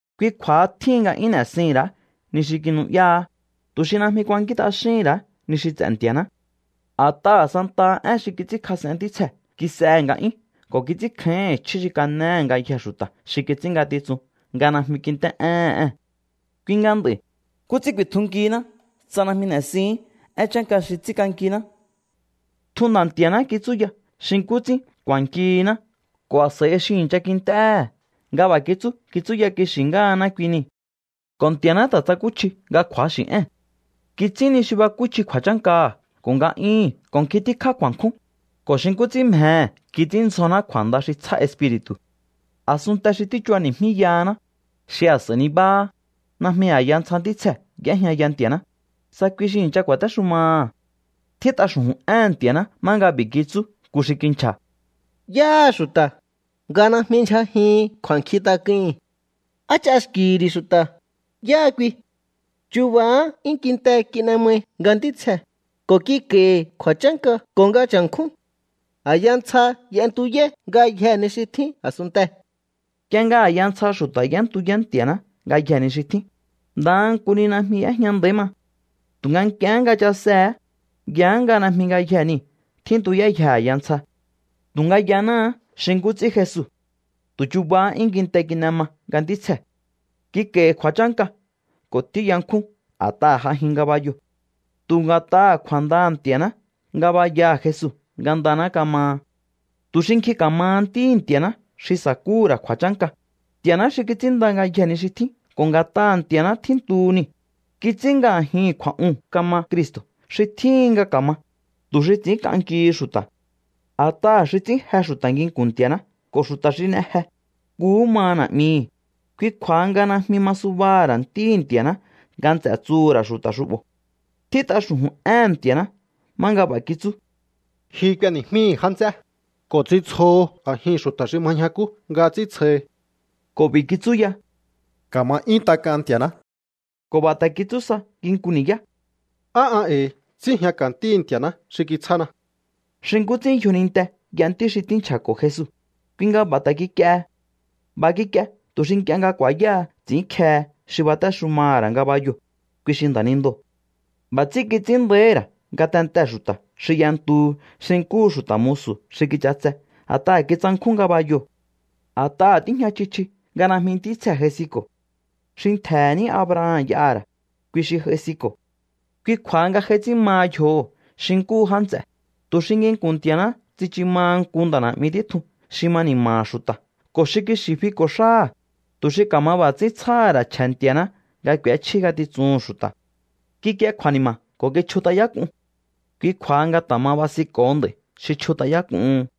Kui kju̱a̱ha tjíhin nga 'yún n'e̱sihi̱n ra̱á ni xi kinu'yáá, tu̱ xi najmi kuankín t'axíhi̱n ra̱á ni xi ts'e̱ Nti̱a̱ná. A̱t'aha̱ santaha én xi kits'ínkjas'en ntítsjee̱ kis'ehe̱ nga'yún ko̱ kits'ínkjáíhi̱n chjí xi kanéhe̱ ngayjee̱ xu̱ta̱ xi kits'ín ngatitsun nga najmi kint'é'éhe̱n ée̱n. Kui nga nd'a̱i̱, ¿nkú ts'ín ku̱i̱tjunkihinná tsa najmi n'e̱sihi̱ín én chánka xi ts'ínk'ankiná? Tjun Nda̱ Nti̱a̱ná kitsúya xi nkú ts'ín ku̱a̱nkihiná ko̱ a̱s'a̱i xi i̱ncha kint'éhe̱ nga b'a̱ kitsú kitsúya kixi̱ ngáhaná kui niu̱. Ko̱ Nti̱a̱ná ta̱ tsakúchji nga kju̱axi̱ ée̱n. Kits'ín ni xi bakúchji kju̱a̱chánkaha̱ ko̱ nga'yúhu̱n ko̱ nkjin tíkjá kju̱a̱nkjún, ko̱ xi nkú ts'ín mjehe̱ kits'ínndzjoná kju̱a̱nda xi tsjá Espiri̱tu̱. A̱sunnte xi tíchubani̱jmíyahaná, xi a̱s'a̱i nibáhá, najmi a̱ya ntsja ntítsjee̱ y'éjñaya Nti̱a̱ná, tsa kui xi i̱ncha ku̱a̱téxumaha̱. Tjít'a xu̱ju̱n éhe̱n Nti̱a̱ná má nga b'i̱ kitsú nku xi kinchja̱: ¿Yáha xu̱ta̱, nga najmi ndyjajihin kju̱a̱nkjintak'uhi̱n? ¿Á ch'axki̱hi̱ ri̱ xu̱ta̱, yáha kui? Chubahá 'yún kinte kin'e mai nga ntítsjee̱, ko̱ kik'a̱i̱hi̱ kju̱a̱chánka ko̱ nga cha̱nkjún. A̱ya ntsja y'entuyáí ngayjee̱ ni xi tjín a̱sunntee̱. Nk'ie nga a̱ya ntsja xu̱ta̱ y'éntuyá Nti̱a̱ná ngayjee̱ ni xi tjín, ndaha nku ni najmi y'éjña nda̱í ma. Tu̱nga nk'iehé nga chasehe̱é, yaá nga najmi ngayjee̱ niu̱ tjíntuyáyje a̱ya ntsja. Tu̱nga yanáá xi nkú ts'ín Jesu. Tu̱ chubahá 'yún kinte kin'e ma nga ntítsjee̱. Kik'a̱i̱hi̱ kju̱a̱chánka ko̱ tíyankjún a̱t'aha̱ j'ajin ngabayoo̱. Tu̱ nga̱t'aha̱ kju̱a̱ndaha̱ Nti̱a̱ná ngabayaha̱ Jesu ngandaná kamaha. Tu̱ xi nkjin ka̱maha ntíhi̱ Nti̱a̱ná xi sa̱kúhu̱ ra̱ kju̱a̱chánka, Nti̱a̱ná xi kits'ínnda ngayjee̱ ni xi tjín ko̱ nga̱t'aha̱ Nti̱a̱ná tjíntuhu niu̱, kits'ín nga a̱jihi̱n kju̱a̱'uu̱n kama Cristo̱ xi tjíhin nga ka̱ma, tu̱ xi ts'i̱ínk'ankihi̱ xu̱ta̱. A̱t'aha̱ xi ts'ín je xu̱ta̱ nginku̱n Nti̱a̱ná ko̱ xu̱ta̱ xi n'e je, nkuhú maha Na̱'mihi̱. Kui kju̱a̱ha nga najmi ma subaha̱ ra̱ Ntíhi̱ Nti̱a̱ná nga nts'e̱ tsuhu̱ ra̱ xu̱ta̱ xu'bo̱. Tjít'a xu̱ju̱n éhe̱n Nti̱a̱ná má nga b'a̱ kitsú: Ji k'ueni̱jmíhi̱ já nts'é, ko̱ ts'intsjoho a̱jihi̱n xu̱ta̱ xi ma ñjakú nga ts'íntsjohi. Ko̱ b'i̱ kitsú ya: Ka̱ma 'yún tak'an Nti̱a̱ná. Ko̱ b'a̱ ta̱ kitsú sa nginku ni̱yá: Á an e̱i̱ síi̱jñaka̱ ntíhi̱ Nti̱a̱ná xi kitsjána. Xi nkú ts'ín yjoninte y'a ntí xi tíi̱nchako̱ Jesu, kui nga b'a̱ ta̱ kik'iehe. B'a̱ kik'ie tu̱ xi nk'ie nga ku̱a̱yáha ts'i̱ínkjehe xi batéxumaha̱ ra̱ ngabayoo̱, kui xi nda̱nindoo̱. B'a̱ ts'ín kits'ín nda̱íhi̱ ra̱ ngatentee̱ xu̱ta̱ xi y'entuhu xi nkúhu xu̱ta̱ musu̱ xi kich'atse a̱t'a̱ha̱ kitsankjún ngabayoo̱. A̱t'aha̱ tíjña chji chji nga najmi ntítsjee̱ j'aisinko̱. Xi ntje̱he̱ ní Abraham y'aha̱ ra̱, kui xi j'aisinko̱. Kui kju̱a̱ha nga j'ai ts'ín maha yjoho̱ xi nkúhu já nts'e̱, tu̱ xi nginku̱n Nti̱a̱ná tsichu maha nku nda̱ na̱'mi títjun xi ma ni̱ma̱ha̱ xu̱ta̱ ko̱ xi kixi̱ fiko̱ xáha̱, tu̱ xi ka̱ma b'a̱ ts'ín tsjáha̱ ra̱ chje̱ Nti̱a̱ná nga k'u̱échjí ngatitsuhu̱n xu̱ta̱. Kikie kju̱a̱ni̱ma̱ ko̱ kichjut'ayák'un. Kui kju̱a̱ha nga ta̱ ma basinko̱ho nd'a̱i̱ xi chjut'ayák'uhun.